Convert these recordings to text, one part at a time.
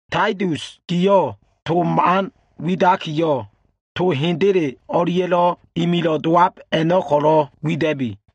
Taitus giyo꞉ to man widakiyo꞉, to hendele o꞉lia꞉lo꞉ ililo꞉ dowab a꞉no꞉ ko꞉lo꞉ wida꞉bi.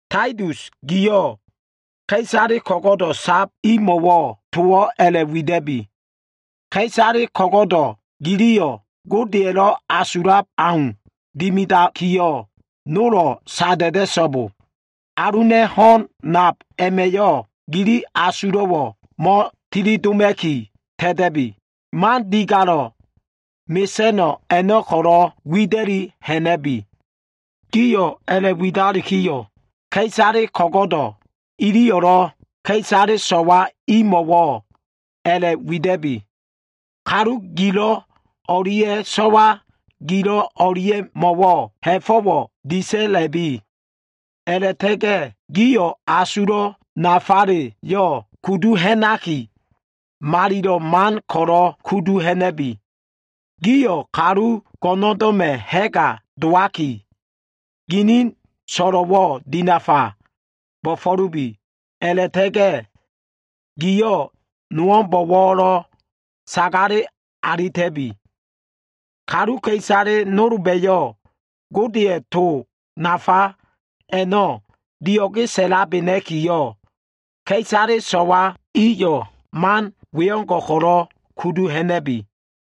Taitus giyo꞉, ka꞉isale ko꞉go꞉do꞉ sab imo꞉wo꞉ towo꞉ a꞉la꞉wida꞉bi. “Ka꞉isale ko꞉go꞉do꞉ giliyo꞉ Godeya꞉lo꞉ asulab au dimidakiyo꞉, nolo꞉ sada꞉da꞉so꞉bo. Aluna꞉ ho꞉n nab a꞉ma꞉yo꞉ gili asulo꞉wo꞉ mo꞉tilidoma꞉ki ta꞉ta꞉bi. Man digalo꞉ mesa꞉no꞉ a꞉no꞉ ko꞉lo꞉ wida꞉li ha꞉na꞉bi.” Giyo꞉ a꞉la꞉widalikiyo꞉, ka꞉isale ko꞉go꞉do꞉ iliyo꞉lo꞉ ka꞉isale kalu ho꞉gilo꞉ ane imo꞉wo꞉lo꞉ a꞉la꞉wida꞉bi. Kalu gilo꞉ o꞉lia꞉ so꞉wa gilo꞉ o꞉lia꞉mo꞉wo꞉ ha꞉fo꞉wo꞉ disa꞉la꞉lubi. A꞉la꞉ta꞉ga꞉ gio꞉ asulo꞉ nafale kudu ha꞉naki, malilo꞉ man a꞉no꞉ ko꞉lo꞉ kudu ha꞉na꞉lubi. Gio꞉ kalu go꞉ndo꞉ma꞉ ha꞉ga dowaki, ginin so꞉lo꞉wo꞉ dinafa bo꞉fo꞉lubi. A꞉la꞉ta꞉ga꞉ gio꞉ nowo꞉mbo꞉wo꞉lo꞉ sagale alita꞉bi. Kaluka꞉isale nolba꞉yo꞉ Godeya꞉ to nafa a꞉no꞉ dio꞉ge sa꞉labena꞉kiyo꞉, ka꞉isale i a꞉no꞉ man we ko꞉lo꞉ kudu hamana꞉ki wida꞉bi.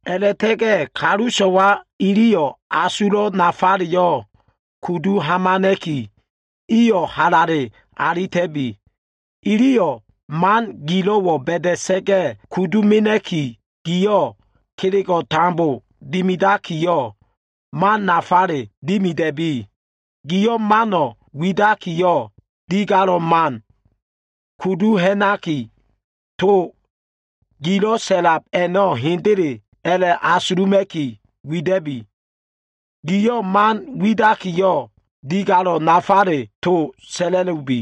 A꞉la꞉ta꞉ga꞉ kalu so꞉wa iliyo꞉ asulo꞉ nafaleyo꞉ kudu hamana꞉ki, iyo꞉ halale alita꞉bi. Iliyo꞉ man gilo꞉wo꞉ ba꞉da꞉sa꞉ga꞉ kudu mena꞉ki, giyo꞉ kelego꞉ tambo dimidakiyo꞉, mano꞉ nafale dimida꞉bi. Giyo꞉ mano꞉ widakiyo꞉, man digalo꞉le kudu ha꞉naki, a꞉la꞉ta꞉ga꞉ to gilo꞉ sa꞉lab a꞉no꞉ hendele a꞉la꞉asuluma꞉ki wida꞉bi. Giyo꞉ to man widakiyo꞉, to nafale digalo꞉ a꞉no꞉ko꞉ sa꞉la꞉lubi.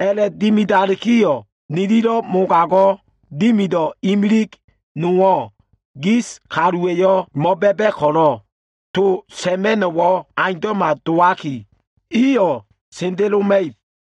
A꞉la꞉dimidalikiyo꞉, nililo꞉ mogago꞉ dimido꞉ imilig nowo꞉ gis kaluwa꞉yo꞉ mo꞉ba꞉ba꞉ ko꞉lo꞉, to sa꞉ma꞉no꞉wo꞉ aundo꞉ma dowaki, iyo꞉ sendeloma꞉ib.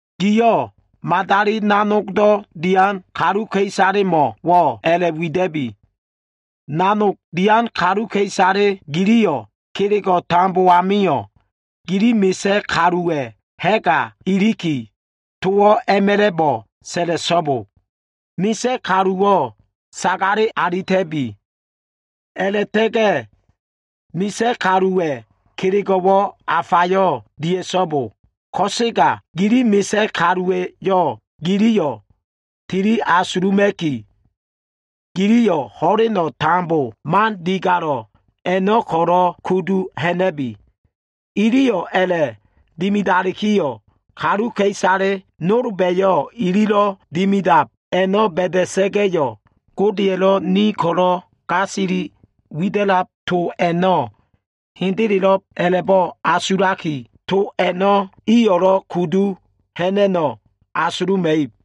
Giyo꞉ madali nanogdo꞉ dian kaluka꞉isalemo꞉wo꞉ a꞉la꞉wida꞉bi. “Nanog dian kaluka꞉isale gio꞉, kelego꞉ tambo amio꞉ gilo꞉ bo꞉fo꞉lowan kaluwa꞉ ha꞉ga iliki, towo꞉ a꞉ma꞉la꞉bo꞉ sa꞉la꞉so꞉bo. Bo꞉fo꞉lowan kaluwo꞉ sagale alita꞉bi. A꞉la꞉ta꞉ga꞉ bo꞉fo꞉lowan kaluwa꞉ kelego꞉wo꞉ afalebo꞉ dia꞉so꞉bo. Ko꞉sega gilo꞉ bo꞉fo꞉lowan kaluwa꞉yo꞉ gio꞉ tili asuluma꞉kiyo꞉, giliyo꞉ ho꞉leno꞉ tambo man digalo꞉ a꞉no꞉ ko꞉lo꞉ kudu ha꞉na꞉lubi.” Iliyo꞉ a꞉la꞉dimidalikiyo꞉, kaluka꞉isale nolba꞉yo꞉ ililo꞉ dimidab a꞉no꞉ ba꞉da꞉sa꞉ga꞉, Godeya꞉lo꞉ ni ko꞉lo꞉ gasili to wida꞉lab a꞉no꞉ hendelelo꞉b a꞉la꞉bo꞉ asulakiyo꞉, to a꞉no꞉ iyo꞉lo꞉ kudu ha꞉na꞉no꞉ asuluma꞉ib.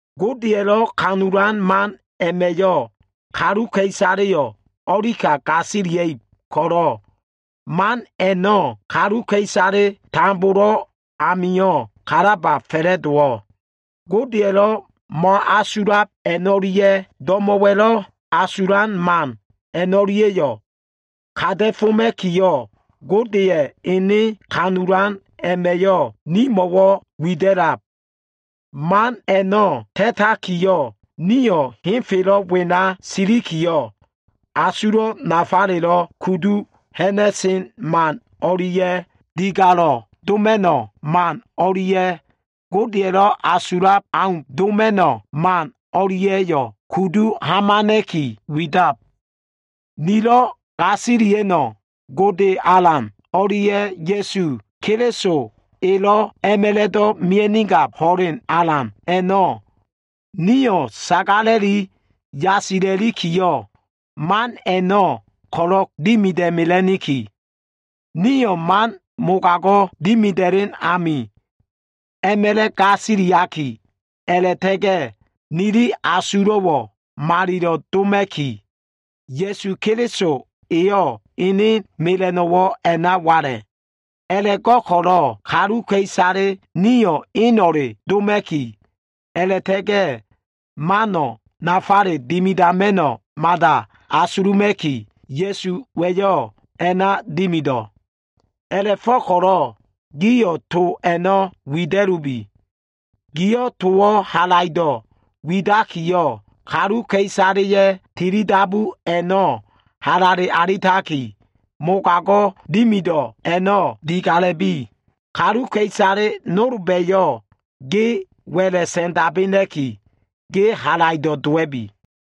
Godeya꞉lo꞉ ha꞉fo꞉ disa꞉lan man a꞉ma꞉yo꞉ kaluka꞉isaleyo꞉ o꞉lika gasilia꞉ib ko꞉lo꞉, man a꞉no꞉ kaluka꞉isale tambolo꞉ amio꞉ kalaba fa꞉la꞉dowo꞉. Godeya꞉lo꞉ mo꞉asulab a꞉no꞉lia꞉ do꞉mo꞉wa꞉lo꞉ asulan man a꞉no꞉lia꞉yo꞉ kata꞉foma꞉kiyo꞉, Godeya꞉ ene ha꞉fo꞉ disa꞉lan man a꞉ma꞉yo꞉ nimo꞉wo꞉ wida꞉lab. Man a꞉no꞉ ta꞉takiyo꞉, nio꞉ henfelo꞉ wena silikiyo꞉, asulo꞉ nafalelo꞉ kudu ha꞉na꞉sen man o꞉lia꞉, digalo꞉ doma꞉no꞉ man o꞉lia꞉, Godeya꞉lo꞉ asulab au doma꞉no꞉ man o꞉lia꞉yo꞉ kudu hamana꞉ki, widab. Nilo꞉ gasilia꞉no꞉ Gode Alan o꞉lia꞉ Ya꞉su Keliso elo꞉ a꞉ma꞉la꞉do꞉ mia꞉nigab ho꞉len alan a꞉no꞉, nio꞉ sagala꞉li yasila꞉likiyo꞉, man a꞉no꞉ ko꞉lo꞉ dimida꞉mela꞉niki. Nio꞉ man mogago꞉ dimida꞉len amio꞉ a꞉ma꞉la꞉ gasiliaki, a꞉la꞉ta꞉ga꞉ nili asulo꞉wo꞉ malilo꞉ doma꞉kiyo꞉, Ya꞉su Keliso eyo꞉ ene mela꞉no꞉wo꞉ a꞉na wala꞉. A꞉la꞉go꞉ko꞉lo꞉ kaluka꞉isale nio꞉ eno꞉le doma꞉ki, a꞉la꞉ta꞉ga꞉ mano꞉ nafale dimidama꞉no꞉ mada asuluma꞉kiyo꞉, Ya꞉suwa꞉yo꞉ a꞉na dimido꞉. A꞉la꞉fo꞉ko꞉lo꞉ giyo꞉ to a꞉no꞉ wida꞉lubi. Giyo꞉ towo꞉ halaido꞉ widakiyo꞉, kaluka꞉isaleya꞉ tilidabu a꞉no꞉ halale alitakiyo꞉, mogago꞉ dimido꞉ a꞉no꞉ digala꞉lubi. Kaluka꞉isale nolba꞉yo꞉ ge wa꞉la꞉ sa꞉ndabena꞉ki, ge halaido꞉ dowa꞉bi.